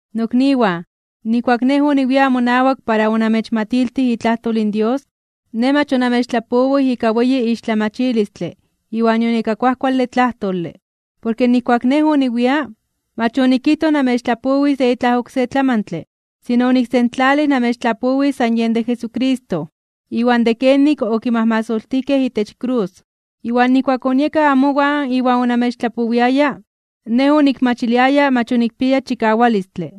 Nokniwan, nijkuak nej oniwia amonawak para onamechmatiltij itlajtol in Dios, nej mach onamechtlapowij ika weyi ixtlamachilistle iwan nion ika kuajkuale tlajtole. Porke nijkuak nej oniwia, mach onikijtoj namechtlapowis de itlaj oksé tlamantle, sino oniksentlalij namechtlapowis san yen de Jesucristo, iwan de kenik okimajmasoltijkej itech krus. Iwan nijkuak onieka amowan iwan onamechtlapowiaya, nej onikmachiliaya mach onikpiaya chikawalistle.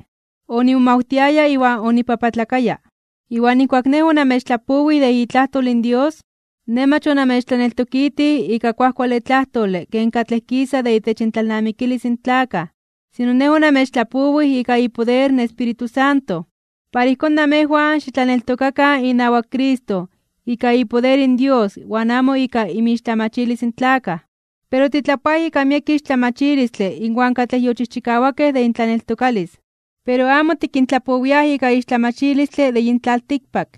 Onimomawtiaya iwan onipapatlakaya (onibibiokaya). Iwan nijkuak nej onamechtlapowij de itlajtol in Dios, nej mach onamechtlaneltokitij ika kuajkuale tlajtole ken katlej kisa de itech intlalnamikilis in tlakaj. Sino nej onamechtlapowij ika ipoder in Espíritu Santo. Para ijkón namejwan xitlaneltokakan inawak Cristo ika ipoder in Dios iwan amo ika inmixtlamachilis in tlakaj. Pero titlapoaj ika miek ixtlamachilistle inwan katlej yochijchikawakej itech intlaneltokalis. Pero amo tikintlapowiaj ika ixtlamachilistle de yin tlaltikpak,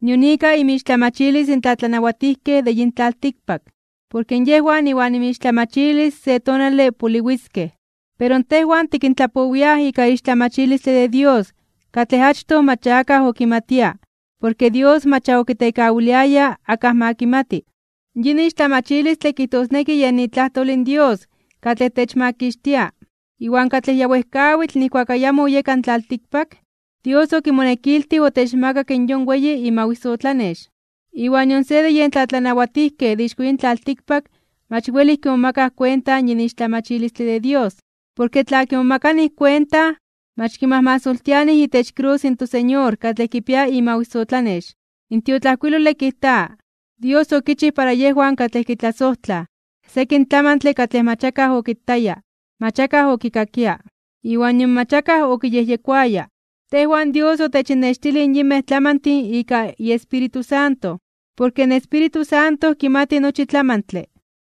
nion ika inmixtlamachilis in tlatlanawatijkej de yin tlaltikpak. Porke yejwan iwan inmixtlamachilis se tonale poliwiskej. Pero tejwan tikintlapowiaj ika ixtlamachilistle de Dios katlej achtoj mach ya akaj okimatia porke Dios mach ya okitekawiliaya akaj ma kimati. Yin ixtlamachilistle kijtosneki yen itlajtol in Dios katlej techmakixtia iwan katlej ya wejkawitl nijkuak ayamo oyeka in tlaltikpak, Dios okimonekiltij otechmakak in yon weyi imawisotlanex. Iwan nion se de yen tlatlanawatijkej de ixko yin tlaltikpak mach welij kimomakaj kuenta yin ixtlamachilistle de Dios. Porke tla kimomakanij kuenta, mach kimajmasoltianij itech krus in toSeñor katlej kipia imawisotlanex. In tiotlajkuilole kijta: Dios okichij para yejwan katlej kitlasojtlaj, sekin tlamantle katlej mach akaj okitaya, mach akaj okikakia, iwan nion mach akaj okiyejyekoaya. Tejwan Dios otechinnextilij yinmej tlamantin ika iEspíritu Santo. Porke in Espíritu Santo kimati nochi tlamantle,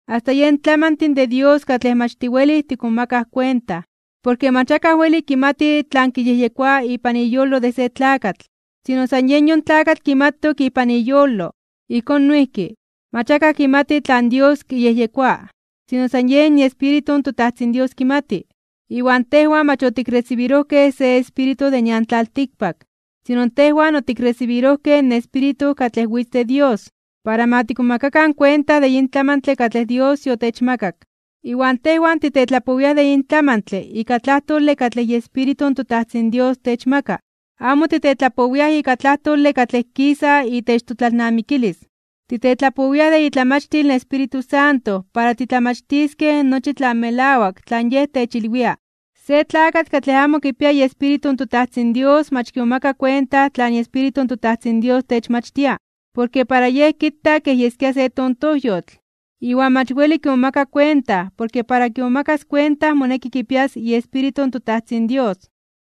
asta yen tlamantin de Dios katlej mach tiwelij tikmomakaj kuenta. Porke mach akaj weli kimati tlan kiyejyekoa ipan iyolo de se tlakatl, sino san yen yon tlakatl kimatok ipan iyolo. Ijkón noijki, mach akaj kimati tlan Dios kiyejyekoa, sino san yen iEspíritu in toTajtzin Dios kimati. Iwan tejwan mach otikresibirojkej se espíritu de nian tlaltikpak, sino tejwan otikresibirojkej in Espíritu katlej witz de Dios, para ma tikmomakakan kuenta de yin tlamantle katlej Dios yotechmakak. Iwan tejwan titetlapowiaj de yin tlamantle ika tlajtole katlej iEspíritu in toTajtzin Dios techmaka. Amo titetlapowiaj ika tlajtole katlej kisa itech totlalnamikilis. Titetlapowiaj de itlamachtil in Espíritu Santo para titlamachtiskej nochi tlan melawak tlan Yej techilwia. Se tlakatl katlej amo kipia iEspíritu in toTajtzin Dios mach kimomaka kuenta tlan iEspíritu in toTajtzin Dios techmachtia, porke para yej kita kej yeskia se tontojyotl. Iwan mach weli kimomaka kuenta porke para kimomakas kuenta moneki kipias iEspíritu in toTajtzin Dios.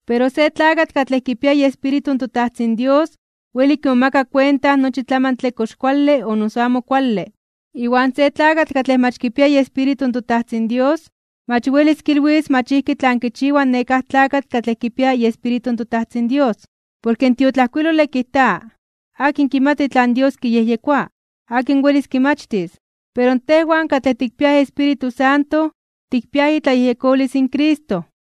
Pero se tlakatl katlej kipia iEspíritu in toTajtzin Dios weli kimomaka kuenta nochi tlamantle kox kuale o noso amo kuale, iwan se tlakatl katlej mach kipia iEspíritu in toTajtzin Dios mach welis kilwis mach ijki tlan kichiwa nekáj tlakatl katlej kipia iEspíritu in toTajtzin Dios. Porke in tiotlajkuilole kijta: “¿Akin kimati tlan Dios kiyejyekoa? ¿Akin welis kimachtis?” Pero tejwan katlej tikpiaj Espíritu Santo, tikpiaj itlayejyekolis in Cristo.